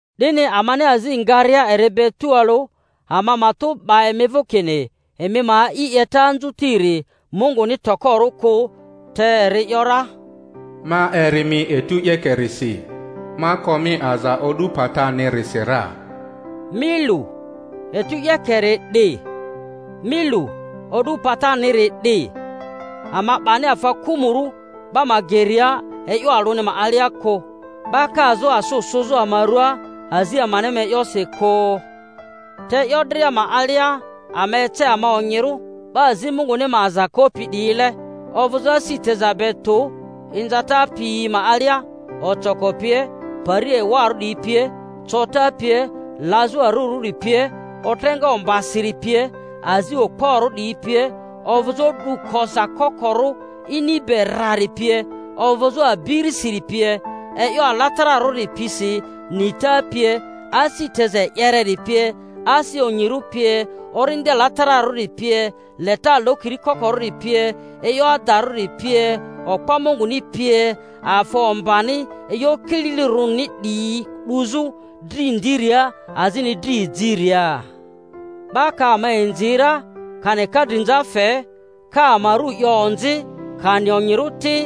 'Dini amani azi ngaria eri be tualᴜ, ama matᴜ 'ba emi vᴜ kini emi ma a'i 'yeta anziutiri Munguni tokorᴜ kᴜ. Te eri ‘yora, Ma eri mi etu 'yekerisi, ma ko mi aza o'du patinirisi ra. Mi lu, etu 'yekeri 'di; mi lu, o'du pataniri 'di. Ama 'bani afa kᴜ-mᴜrᴜ 'ba ma geria e'yo alᴜni ma alia kᴜ, 'ba kazᴜ asᴜ sᴜzᴜ ama ruaa azi amani ma e'yosi kᴜ, te e'yo dria ma alia ama ece ama onyirᴜ, 'ba azi Munguni ma aza kopi 'diyile: ovᴜzᴜ asi teza be tᴜ, inzata piyi ma alia, ocoko pie, pari ewarᴜ 'diyi pie, cota pie, lazᴜ arurᴜri pie, otreŋa ombasiri pie, azi okporᴜ 'diyi pie, ovᴜzᴜ o'du koza kokorᴜ ini be rrari pie, ovᴜzᴜ abirisiri pie; e'yo alatararᴜri pisi, nita pie, asi teza e'yereri pie, asi onyirᴜ pie, Orindi Alatararᴜri pie, leta lokiri kokorᴜri pie, e'yo adarᴜri pie, okpo Munguni pie; afa ombani e'yo kililirᴜrini 'diyi 'duzᴜ dri ndiria azini dri ejiria; 'ba ka ama inzi ra kani ka drinza fe, ka ama ru 'yo onzi kani onyirᴜ ti.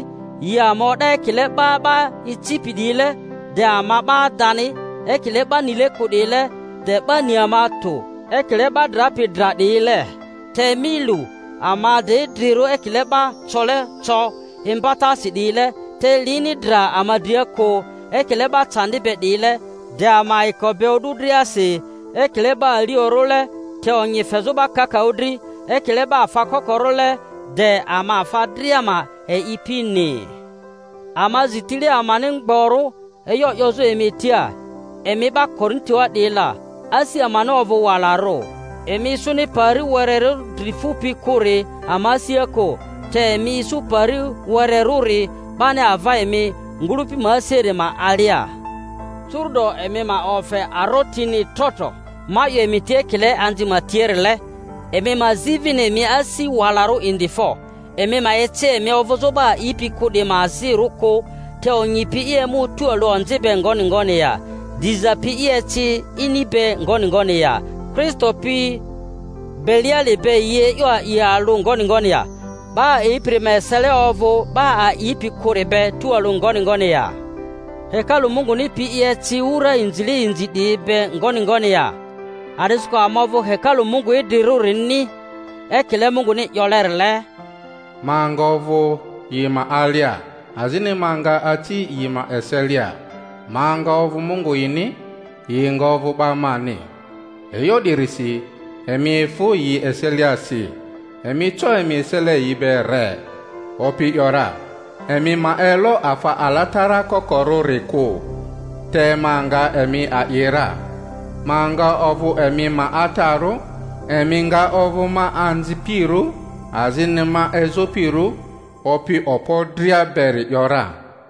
Yi ama o'da ekile 'ba 'ba icipi 'diyile, de ama 'ba adani; ekile 'ba nile kᴜ 'diyile, de 'ba ni ama tᴜ; ekile 'ba drapi dra 'diyile, te mi lu, ama de idrirᴜ; ekile 'ba cole co imbatasi 'diyile, te lini dra ama dria kᴜ; ekile 'ba candi be 'diyile, de ama ayiko be o'du driasi; ekile'ba aliorᴜle, te lonyi fezᴜ 'ba kakaᴜ dri; ekile 'ba afa kokorᴜle, de ama afa dria ma e'ipini. Ama zi tile amani mgborᴜ e'yo 'yozᴜ emi tia, emi 'ba Korintoa 'diyi la; asi amani ovᴜ walarᴜ. Emi isuni pari wererᴜ dri fupi kᴜri ama asia kᴜ, te emi isu pari wererᴜri bani ava emi ngᴜlᴜpi ma asiari ma alia. Curu'do emi ma ofe arotini tro tro—ma 'yo emi tia ekile anzi ma tiarile—emi ma zi vini emi asi walarᴜ indi fo! Emi ma eci emi ovᴜzᴜ 'ba a'ipi kᴜ 'diyi ma azirᴜ kᴜ. Te onyi pi i emᴜ tualᴜ onzi be ngoni ngoni ya? Diza pi i eci ini be ngoni ngoni ya? Kristo pi Beliali be yi e'yo a'i alᴜ ngoni ngoni ya? 'Ba a'ipiri ma esele ovᴜ 'ba a'ipi kᴜri be tualᴜ ngoni ngoni ya? Hekalu Munguni pi i eci wura inzile inzi 'diyi be ngoni ngoni ya? A'disikᴜ ama ovᴜ hekalu Mungu idrirᴜrini; ekile Munguni 'yolerile, Ma nga ovᴜ yi ma alia, azini ma nga aci yi ma eselia, ma nga ovᴜ Mungu yini, yi nga ovᴜ 'ba mani. E'yo 'dirisi emi efᴜ yi eseliasi, emi co emi esele yi be re, Opi ‘yora, emi ma elo afa alatara kokorᴜri kᴜ; te ma nga emi a'i ra, ma nga ovᴜ emi ma Atarᴜ, emi nga ovᴜ ma anzipirᴜ azini ma ezopirᴜ, Opi Okpo dria beri 'yo ra.